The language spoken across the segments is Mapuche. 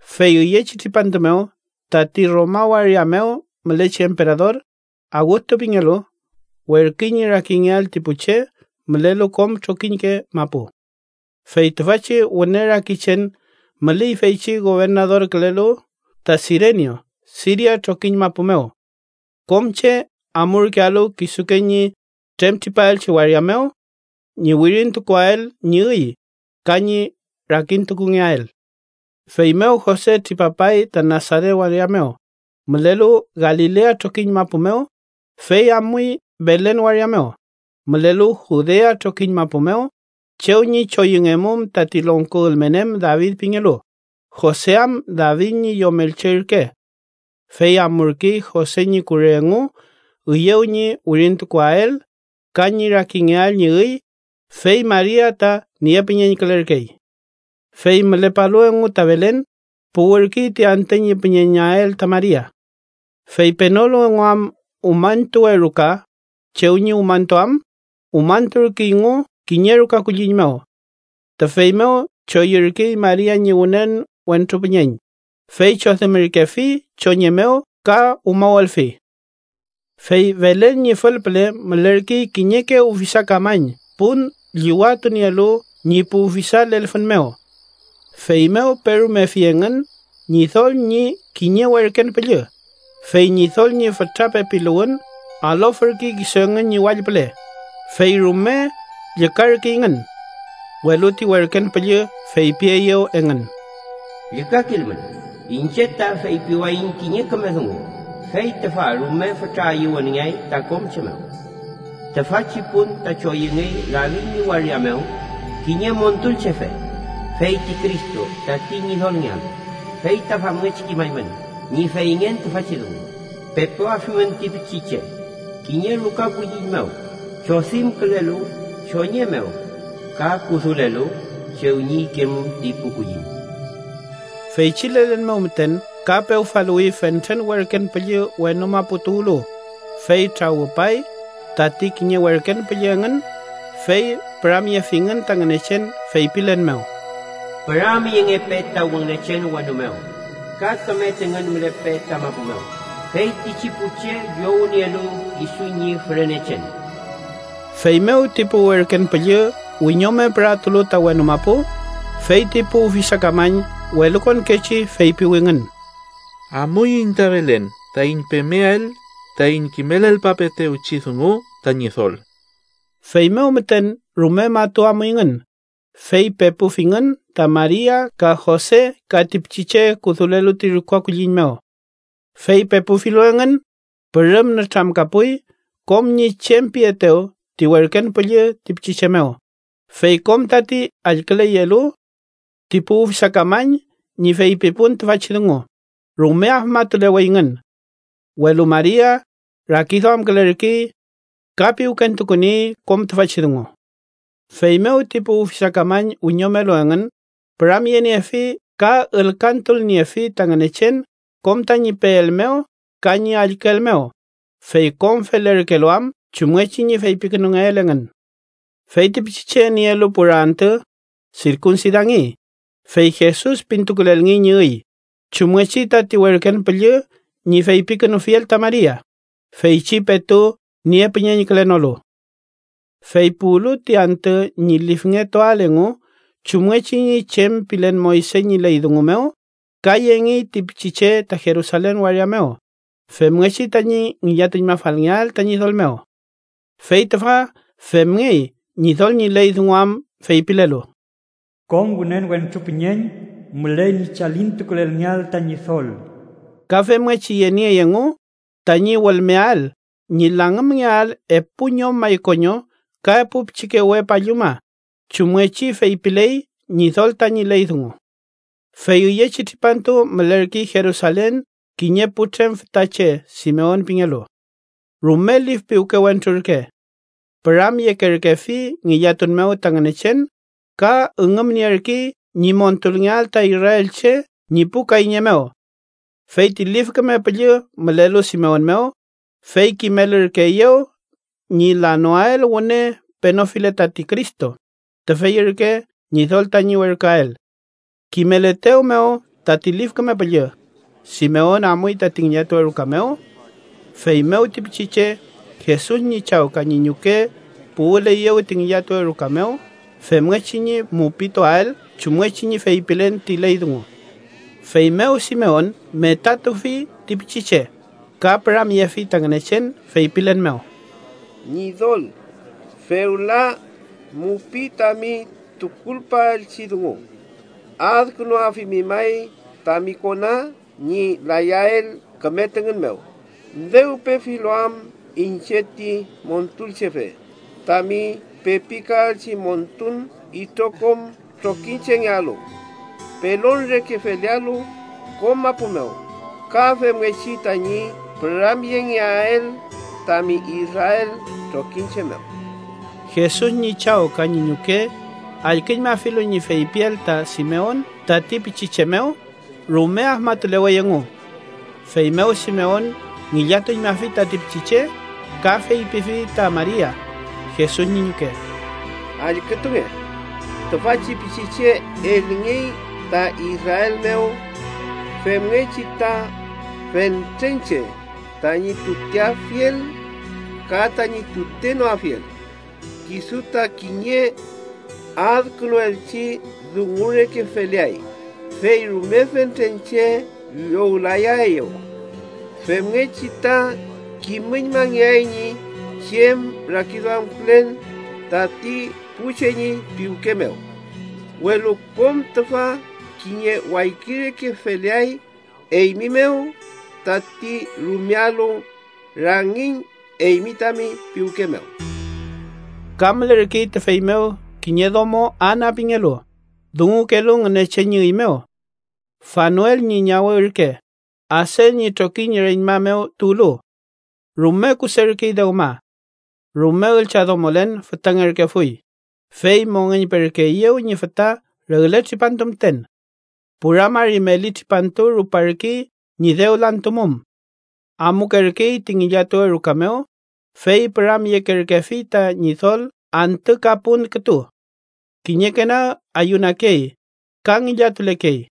Fey üyechi tripantu mew tati Roma waria mew mülechi emperador, Awgustu pingelu, werküy ñi rakingeael ti pu che mülelu kom trokiñke mapu. Fey tüfachi wüne rakichen müley feychi gobernadorkülelu ta Sirenio Siria trokiñ mapu mew. Kom che amurkealu kisuke ñi tremtripaelchi waria mew ñi wirintukuael ñi üy ka ñi rakintukungeael. Feymew Jose tripapay ta Nasaret waria mew, mülelu Galilea trokiñ mapu mew, fey amuy Belen waria mew, mülelu Judea trokiñ mapu mew, chew ñi choyüngemum tati longko ülmen em David pingelu, Jose am David ñi yomelche ürke. Fey amurkey Jose ñi kure engu üyew ñi wirintukuael ka ñi rakingeael ñi üy, fey Maria ta niepüñeñkülerkey. Fey mülepalu engu ta Belen, puwürkey ti antü ñi püñeñael ta Maria. Fey penolu engu am umañtuwe ruka chew ñi umañtuam, umañturkeyngu kiñe ruka kulliñ mew. Tüfey mew choyürkey Maria ñi wünen wentru püñeñ, fey chodimürkefi choñe mew ka umawelfi. Fey Belen ñi fülpüle mülerkey kiñeke ufisakamañ pun llüwatunielu ñi pu ufisa lelfün mew. Feymew perumefi engün Ñidol ñi kiñe werken püllü, fey Ñidol ñi fütra pepiluwün alofürkey kisu engün ñi wall püle, fey rume llükarkeyngün. Welu ti werken püllü feypieyew engün: “Llükakilmün. Iñche ta feypiwayiñ kiñe küme dungu, fey tüfa rume fütra ayüwünngeay ta kom che mew. Tüfachi pun ta choyüngey David ñi waria mew kiñe Montulchefe, feyti Cristo, tati Ñidolngealu. Fey ta famngechi kimaymün ñi feyngen tüfachi dungu: Pepuafimün ti pichiche, kiñe ruka kulliñ mew chodimkülelu choñe mew ka kudulelu chew ñi ikemum ti pu kulliñ.” Feychi lelen mew müten ka pewfaluwi fentren werken püllü wenu mapu tuwlu, fey trawüpay tati kiñe werken püllü engün, fey püramyefingün ta Ngünechen feypilen mew: “¡Püramyengepe ta Ngünechen wenu mew! Ka küme tüngün mülepe ta mapu mew feytichi pu che llownielu kisu ñi fürenechen.” Feymew ti pu werken püllü wiñome püratulu ta wenu mapu, fey ti pu ufisakamañ welukonkechi feypiwingün: “Amuiñ ta Belen taiñ pemeael taiñ kimelngepapeelchi dungu ta Ñidol.” Feymew müten rume matu amuyngün, fey pepufingün ta Maria ka Jose ka ti pichiche kudulelu ti ruka kulliñ mew. Fey pepufilu engün, pürüm nütramkapuy kom ñi chem pietew ti werken püllü ti pichiche mew, fey kom tati allküleyelu ti pu ufisakamañ ñi feypipun tüfachi dungu, rume afmatuleweyngün. Welu Maria rakiduamkülerkey ka piwkentukuniey kom tüfachi dungu. Feymew ti pu ufisakamañ wiñomelu engün, püramyeniefi ka ülkantulniefi ta Ngünechen kom tañi peel mew ka ñi allküel mew, fey kom felerkelu am chumngechi ñi feypikünungeel engün. Fey ti pichiche nielu pura antü, sirkunsidangey, fey Jesus pintukulelngey ñi üy, chumngechi tati werken püllü ñi feypikünufiel ta Maria, feychi petu niepüñeñkülenolu. Fey puwlu ti antü ñi lifngetuael engu chumngechi ñi chem pilen Moyse ñi ley dungu mew, ka yengey ti pichiche ta Jerusalen waria mew femngechi tañi ngillatuñmafalngeael ta Ñidol mew. Fey tüfa femngey Ñidol ñi ley dungu am feypilelu: “Kom wünen wentru püñeñ müley ñi chalintukulelngeael ta Ñidol.” Ka femngechi yeniey engu tañi wülmeael ñi langümngeael epu ñom maykoño ka epu pichike we palluma chumngechi feypiley Ñidol tañi ley dungu. Fey üyechi tripantu mülerkey Jerusalen kiñe putrem fütache Simeon pingelu. Rume lif piwke wentru ürke. Püramyekerkefi ngillatun mew ta Ngünechen ka üngümnierkey ñi montulngeael ta israelche ñi pu kayñe mew. Fey ti Lif Küme Püllü mülelu Simeon mew, fey kimelürkeeyew ñi lanoael wüne penofile tati Cristo, tüfey ürke Ñidol tañi werküael. Kimeletew mew tati Lif Küme Püllü, Simeon amuy tati ngillatuwe ruka mew. Feymew ti pichiche Jesus ñi chaw ka ñi ñuke puwüleyew ti ngillatuwe ruka mew femngechi ñi mupituael chumngechi ñi feypilen ti ley dungu. Feymew Simeon metatufi ti pichiche ka püramyefi ta Ngünechen feypilen mew: “Ñidol, fewla mupiy tami tukulpaelchi dungu. Adkünuafimi may tami kona ñi layael küme tüngün mew, dew pefilu am iñche ti Montulchefe, tami pepikaelchi montun itrokom trokiñchengealu. Pelon reke felealu kom mapu mew, ka femngechi tañi püramyengeael tami Israel trokiñche mew.” Jesus ñi chaw ka ñi ñuke, allküñmafilu ñi feypiel ta Simeon tati pichiche mew, rume afmatulewey engu. Feymew Simeon ngillatuñmafi tati pichiche, ka feypifi ta Maria, Jesus ñi ñuke: —Allkütunge. Tüfachi pichiche elngey ta Israel mew femngechi ta fentren che tañi tuteafiel ka tañi tutenoafiel. Kisu ta kiñe adkünuelchi dungu reke feleay, fey rume fentren che llowlayaeyew. Femngechi ta kimüñmangeay ñi chem rakiduamkülen tati pu che ñi piwke mew. Welu kom tüfa kiñe wayki reke feleay eymi mew tati rumealu rangiñ eymi tami piwke mew. Ka mülerkey tüfey mew kiñe domo Ana pingelu, dungukelu Ngünechen ñi üy mew. Fanuel ñi ñawe ürke, Aser ñi trokiñ reñma mew tuwlu. Rume kuserkey dewma. Rume üllchadomolen fütangerkefuy, fey mongeñperkeeyew ñi füta regle tripantu müten. Pura mari meli tripantu ruparkey ñi dew lantumum. Amukerkey ti ngillatuwe ruka mew, fey püramyekerkefi ta Ñidol antü ka pun kütu. Kiñeke nag ayunakey ka ngillatulekey.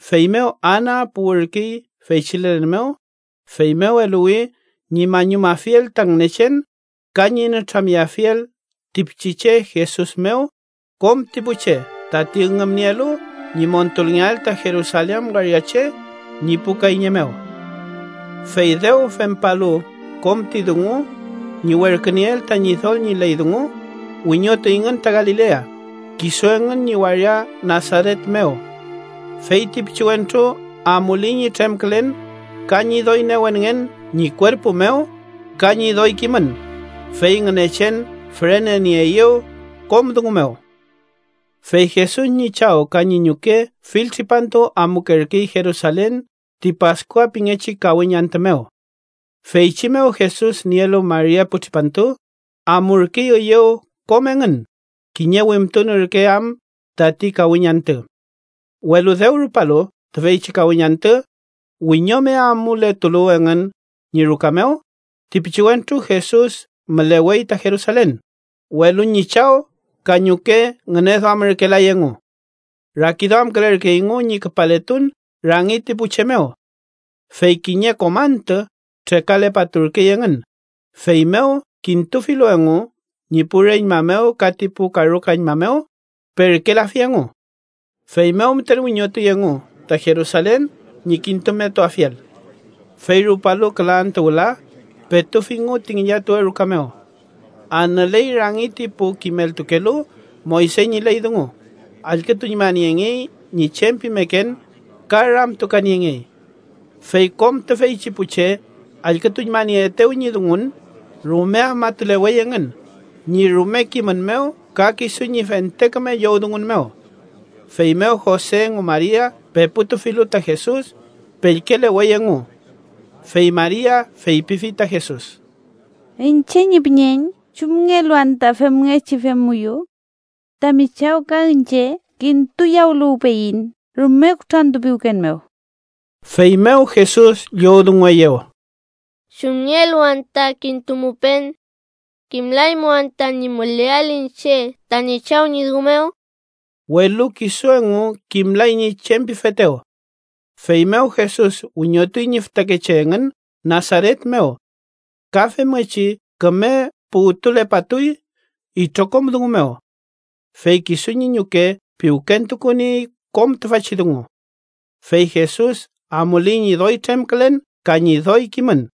Feymew Ana puwürkey feychi lelen mew, feymew eluwi ñi mañumafiel ta Ngünechen ka ñi nütramyeafiel ti pichiche Jesus mew kom ti pu che tati üngümnielu ñi montulngeael ta Jerusalen waria che ñi pu kayñe mew. Fey dew fempalu kom ti dungu ñi werkünieel ta Ñidol ñi ley dungu, wiñotuyngün ta Galilea, kisu engün ñi waria Nasaret mew. Fey ti pichiwentru amuley ñi tremkülen ka ñi doy newenngen ñi kuerpu mew ka ñi doy kimün, fey Ngünechen fürenenieeyew kom dungu mew. Fey Jesus ñi chaw ka ñi ñuke fill tripantu amukerkey Jerusalen ti Paskua pingechi kawiñ antü mew. Feychi mew Jesus nielu mari epu tripantu, amurkey üyew kom engün, kiñe wimtun ürke am tati kawiñ antü. Welu dew rupalu tüfeychi kawiñ antü, wiñome amuletulu engün ñi ruka mew, ti pichiwentru Jesus mülewey ta Jerusalen, welu ñi chaw ka ñuke ngüneduamürkelay engu. Rakiduamkülerkeyngu ñi küpaletun rangi ti pu che mew. Fey kiñe kom antü trekalepaturkey engün, feymew kintufilu engu ñi pu reñma mew ka ti pu karukañma mew, perkelafi engu. Feymew müten wiñotuy engu ta Jerusalen ñi kintumetuafiel. Fey rupalu küla antü wüla, petufingu ti ngillatuwe ruka mew. Anüley rangi ti pu kimeltukelu Moyse ñi ley dungu, allkütuñmaniengey ñi chem pimeken ka ramtukaniengey. Fey kom tüfeychi pu che allkütuñmanieetew ñi dungun, rume afmatulewey engün ñi rume kimün mew ka kisu ñi fente küme llowdungun mew. Feymew Jose engu Maria peputufilu ta Jesus, pellkelewey engu. Fey Maria feypifi ta Jesus: —Iñche ñi püñeñ, ¿chumngelu anta femngechi femmuyu? Tami chaw ka iñche kintuyawüluwpeyiñ rume kutrantupiwken mew. Feymew Jesus llowdungueyew: —¿Chumngelu anta kintumupen? ¿Kimlaymu anta ñi müleael iñche tañi Chaw ñi dungu mew? Welu kisu engu kimlay ñi chem pifetew. Feymew Jesus wiñotuy ñi fütakeche engün Nasaret mew. Ka femngechi küme puwtulepatuy itrokom dungu mew. Fey kisu ñi ñuke piwkentukuniey kom tüfachi dungu. Fey Jesus amuley ñi doy tremkülen ka ñi doy kimün.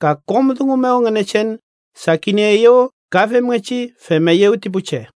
Ka kom dungu mew Ngünechen sakinieeyew ka femngechi femeyew ti pu che.